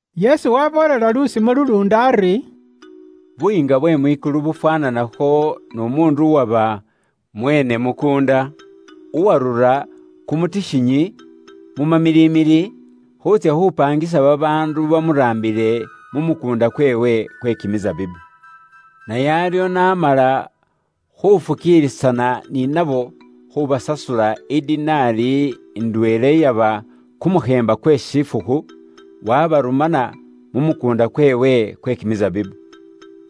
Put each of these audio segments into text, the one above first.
Yesu waaboolela lusimo luluundi ari, “Buyiinga bwe mwikulu bufwaananakho n'umuundu uwaba mweene mukuunda, uwarura kumutikhinyi, mu mamilimili, khuutsya khupangisa babaandu bamuraambile mu mukuunda kweewe kwe kimisabibu. Naye aryo n'amala khufukiilisana ni nabo khubasasula i Dinari ndweela iyaba kumukheemba kwe shifukhu, wabarumana mu mukuunda kweewe kwe kimisabibu.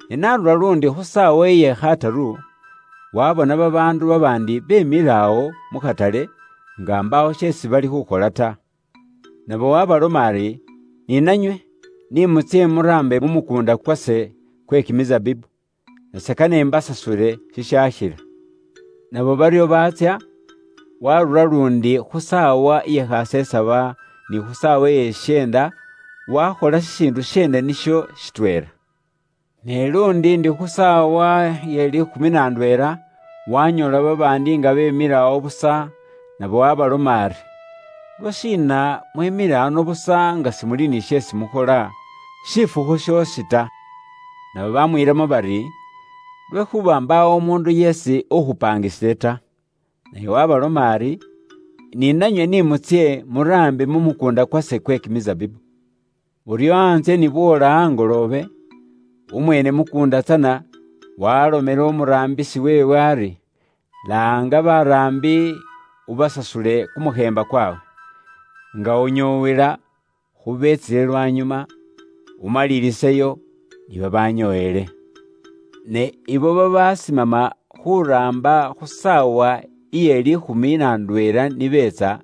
Ne n'arura luundi khu saawa iye khataru, waabona babaandu babaandi beemile awo mu khatale nga mbaawo sheesi bali khukhola ta. Nabo waabaloma ari, ‘Ni nanywe ni mutsye muraambe mu mukuunda kwase kwe kimisabibu, nase kane imbasasule shishaakhila.’ Nabo baryo baatsya. “Waarura luundi khu saawa iye khasesaba, ni khu saawa iye shisheenda, waakhola shishiindu sheene nisho shitweela. Ne luundi ndi khu saawa iye liikhumi na ndweela, waanyoola babaandi nga beemile awo busa, nabo waabaloma ari, ‘Lwashiina inywe mwemile ano busa nga mbaawo sheesi mukhola shifukhu shoosi ta?’ Nabo baamwiilamo bari, ‘Lwekhuuba mbaawo umuundu yeesi ukhupaangisile ta.’ “Naye waabaloma ari, ‘Ni nanywe ni mutsye muraambe mu mukuunda kwase kwe kimisabibu.’” “Buryo antsye ni bwoola angoloobe, umweene mukuunda tsana waalomela umuraambisi weewe ari, ‘laanga baraambi ubasasule kumukheemba kwawe, nga unyoowela khu beetsile lwanyuma, umaliliseyo ni babanyoowele.’ Ne abo babasimama khuuraamba khu saawa iye liikhumi na ndweela ni beetsa,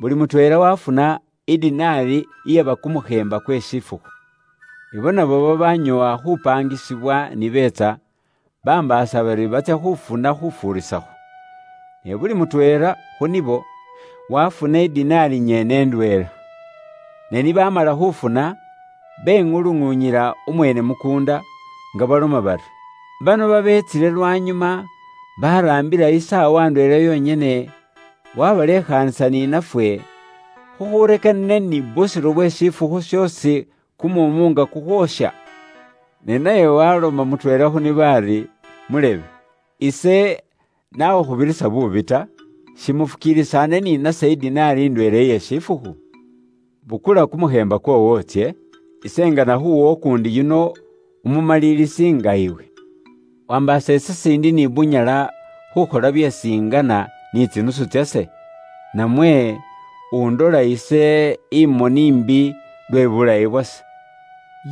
buli mutweela waafuna i Dinari iyaba kumukheemba kwe shifukhu. abo nabo babaanyoowa khupaangisibwa ni beetsa, bambaasa bari batsya khufuna khufuurisakho. Ne buli mutweela khu nibo waafuna i Dinari nyene ndweela. Ne ni baamala khufuna, beŋuluŋuunyila umweene mukuunda nga baloma bari, ‘Bano babeetsile lwanyuma baraambila isaawa ndweela yonyene, waabalekhaasa ni nafwe, khukhurekanile ni busiro bwe shifukhu shoosi kumuumu nga kukhwoosha?’ “Ne naye welamo mutweela khu nibo ari, ‘Mulebe, ise nakhukhubirisa buubi ta. Simufukiilisaane ni nase i dinari ndweela iye shifukhu? Bukula kumukheemba kwoowo utsye. Ise ngana khuuwa ukuundi yuno umumalilisi nga iwe. Wambaasa ise siindi ni bunyala khukhola byeesi ingana ni tsinusu tsase? Namwe undola ise imoni imbi lwe buulayi bwase?’”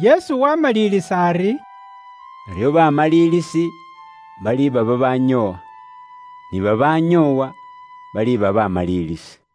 Yesu waamalilisa ari, “Baryo baamalilisi baliiba babaanyoowa, ni babaanyoowa, baliiba baamalilisi.”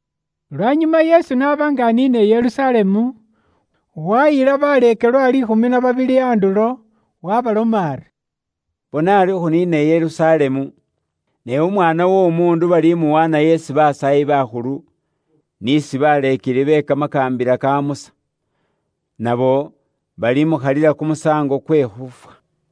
Lwanyuma Yesu n'aba nga aniina i Yerusalemu, waayila baleekelwa liikhumi na babili andulo, waabaloma ari, “Bona ari khuniina i Yerusalemu, ne Umwaana w'Omuundu balimuwaanayo isi basaayi bakhulu, n'isi baleekeli be kamakaambila ka Musa. Nabo balimukhalila kumusaango kwe khuufwa,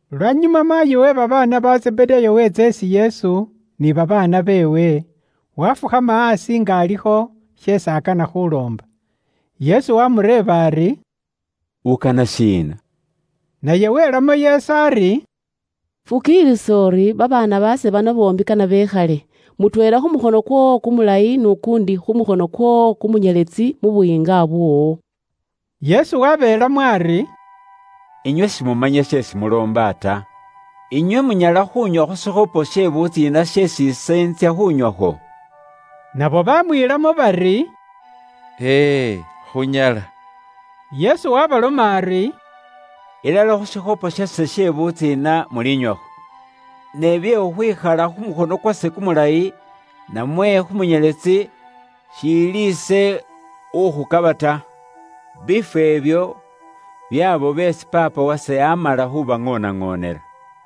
Lwanyuma maayi we babaana ba Zebedaayo weetsa isi Yesu ni babaana beewe, waafukhama aasi nga alikho ni sheesi akana khuumuloomba. Yesu waamureeba ari “Ukana shiina?” Naye welamo Yesu ari, “Fukiilisa uri babaana baase bano boombi kane bekhale, mutweela khu mukhono kwoowo kumulayi n'ukuundi khu mukhono kwoowo kumunyeletsi mu Buyiinga bwoowo.” Yesu wabeelamo ari, “Inywe simumanya sheesi muloomba ta. Inywe munyala khuunywa khu shikhopo she butsiina sheesi ise intsya khunywakho?” Nabo bamwiilamo bari, “E e khunyala.” Yesu waabaloma ari, “Ilala khu shikhopo shase she butsiina mulinywakho, ne bye khukhwikhala khu mukhono kwase kumulayi, namwe khu munyeletsi, shiili ise ukhukaba ta. Biifwo ibyo byaabo beesi Paapa wase amala khubiŋoonaŋoonela.”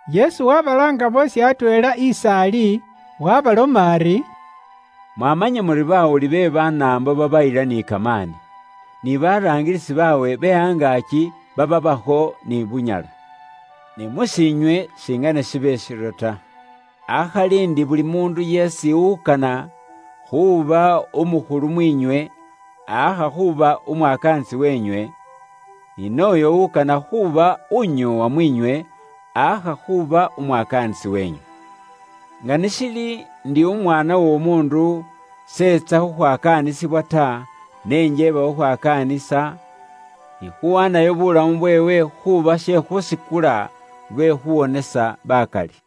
Yesu wabalaanga boosi atweela is'ali, waabaloma ari, “Mwamanya muri bawuli be Banaambo babayila ni kamaani. Ni baraangilisi baabwe be angaaki babaabakho ni bunyala. Ne mus'iinywe singene shibe shiryo ta. Akhali ndi buli muundu yeesi ukana khuuba umukhulu mwiinywe, aakha khuuba umwakaanisi wenywe, ni nooyo ukana khuuba unyoowa mwiinywe aakha khuuba umwakaanisi weenywe. Nga ni shili ndi Umwaana w'Omuundu s'etsa khukhwakaanisibwa ta, ne njeeba khukhwakaanisa, ni khuwaanayo bulamu bweewe khuuba she khusikula lwe khuwonesa bakali.”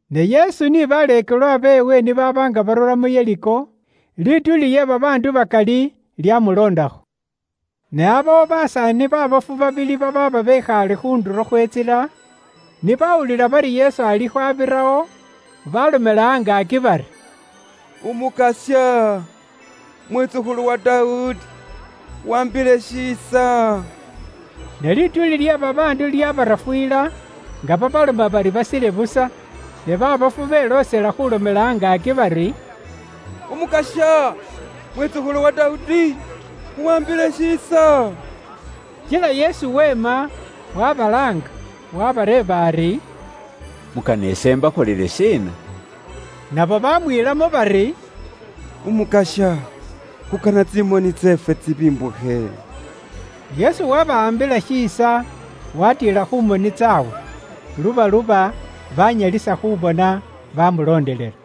Ne Yesu ni baleekelwa beewe ni baaba nga barura mu Yeriko, lituuli lye babaandu bakali lyamuloondakho. Ne aabawo basaani baabofu babili babaaba bekhaale khu ndulo khwe ntsila, ni baawulila bari Yesu alikho abirawo, baalomela angaaki bari, “Umukasya, Mwitsukhulu wa Dawudi, khuwaambile shiisa!” Ne lituuli lye babaandu lyaabarafuyila, nga babaloma bari basile busa, ne baabofu beloosela khuulomela angaaki bari, “Umukasya, Mwitsukhulu wa Dawudi, khuwaambile shiisa.” Kila Yesu weema, wabalaanga. Waabareeba ari, “Mukana ise imbakholele shiina?” Nabo baamwiilamo bari, “Umukasya, khukana tsimoni tseefwe tsibimbukhe.” Yesu wabawaambila shiisa, waatiila khu moni tsaabwe. Lubaluba, baanyalisa khuubona, baamuloondelela.